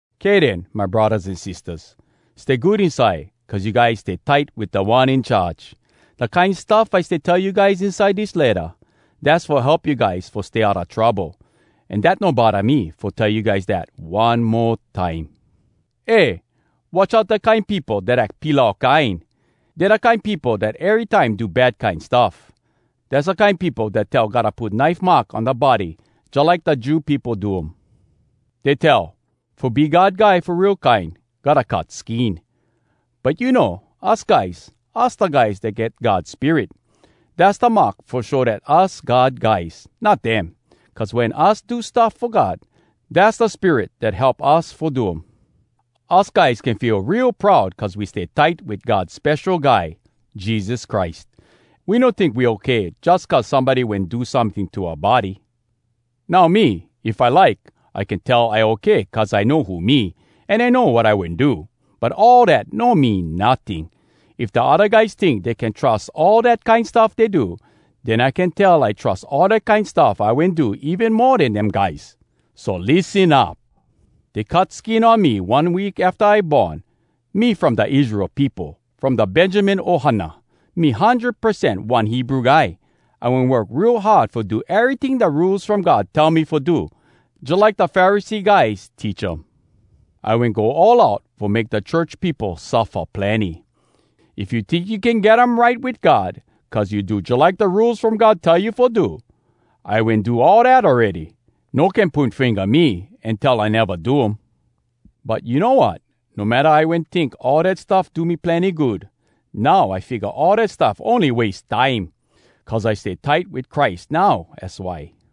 Kay den, my braddahs an sistahs. Stay good inside cuz you guys stay tight wit Da One In Charge! Da kine stuff I stay tell you guys inside dis letta, dass fo help you guys fo stay outa trouble, an dat no bodda me fo tell you guys dat one mo time. Eh! Watch out da kine peopo dat ack pilau kine! Dey da kine peopo dat erytime do bad kine stuff. Dass da kine peopo dat tell gotta put knife mark on da body jalike da Jew peopo do um. Dey tell, “Fo be God guy fo real kine, gotta cut skin.” But you know, us guys, us da guys dat get God Spirit. Dass da mark fo show dat us God guys, not dem. Cuz wen us do stuff fo God, dass da Spirit dat help us fo do um. Us guys can feel real proud cuz we stay tight wit God Spesho Guy, Jesus Christ. We no tink we okay jus cuz somebody wen do someting to oua body. Now me, if I like, I can tell I okay cuz I know who me, an I know wat I wen do. But all dat no mean notting. If da odda guys tink dey can trus all dat kine stuff dey do, den I can tell I trus all da kine stuff I wen do even mo den dem guys. So lissen up! Dey cut skin on me one week afta I born. Me from da Israel peopo, from da Benjamin ohana. Me hundred percent one Hebrew guy. I wen work real hard fo do eryting da Rules From God tell me fo do, jalike da Pharisee guys teach um. I wen go all out fo make da church peopo suffa plenny. If you tink you can get um right wit God cuz you do jalike da Rules From God tell you fo do, I wen do all dat awready. No can poin finga me an tell I neva do um. But you know wat? No matta I wen tink all dat stuff do me plenny good, now I figga all dat stuff ony wase time! Cuz I stay tight wit Christ now az why.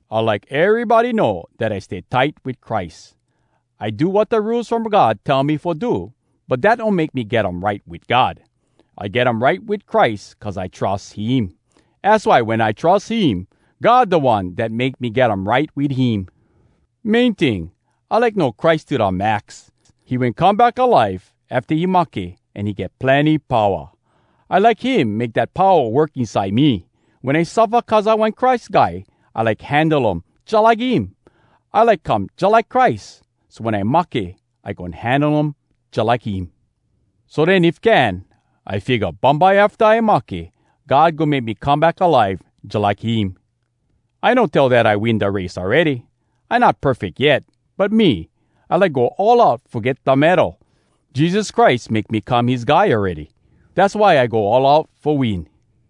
I like erybody know dat I stay tight wit Christ. I do wat da Rules From God tell me fo do, but dat no make me get um right wit God. I get um right wit Christ cuz I trus him! Az why wen I trus him, God da One dat make me get um right wit him. Main ting, I like know Christ to da max. He wen come back alive afta he mahke an he get plenny powa. I like him make dat powa work inside me. Wen I suffa cuz I one Christ Guy, I like handle um jalike him. I like come jalike Christ, so wen I mahke, I goin handle um jalike him. So den if can, I figga, bumbye afta I mahke, God goin make me come back alive jalike him. I no tell dat I win da race awready. I not perfeck yet. But me, I like go all out fo get da medal. Jesus Christ make me come his guy awready. Dass why I go all out fo win.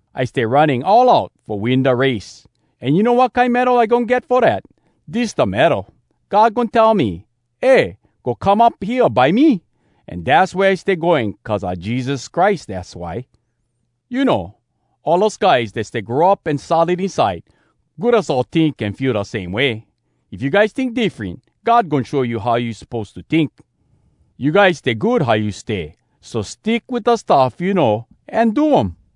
I stay running all out fo win da race. An you know wat kine medal I goin get fo dat? Dis da medal: God goin tell me, “Eh! Go come up hea by me!” An dass wea I stay going cuz a Jesus Christ, dass why. You know, all us guys dat stay grow up an solid inside, good us all tink an feel da same way. If you guys tink diffren, God goin show you how you suppose to tink. You guys stay good how you stay, so stick wit da stuff you know an do um.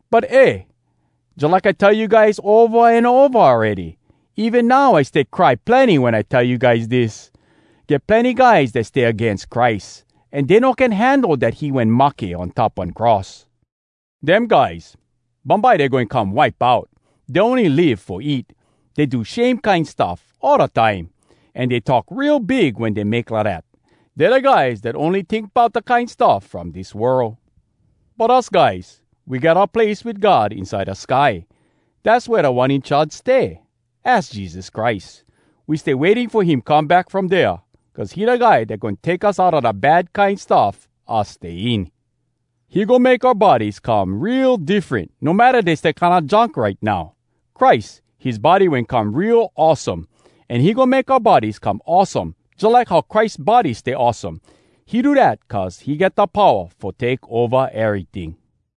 But eh! Jalike I tell you guys ova an ova awready, an even now I stay cry plenny wen I tell you guys dis: Get plenny guys dat stay agains Christ, an dey no can handle dat he wen mahke on top one cross. Dem guys, bumbye dey goin come wipe out. Dey ony live fo eat. Dey do shame kine stuff all da time, an dey talk real big wen dey make lidat. Dey da guys dat ony like tink bout da kine stuff from dis world. But us guys, we get oua place wit God inside da sky. Dass wea Da One In Charge stay—az Jesus Christ. We stay waiting fo him come back from dea, cuz he da guy dat goin take us outa da bad kine stuff us stay in. He goin make oua bodies come real diffren, no matta dey stay kinda junk right now. Christ, his body wen come real awesome, an he goin make oua bodies come awesome jalike how Christ body stay awesome. He do dat cuz he get da powa fo take ova eryting.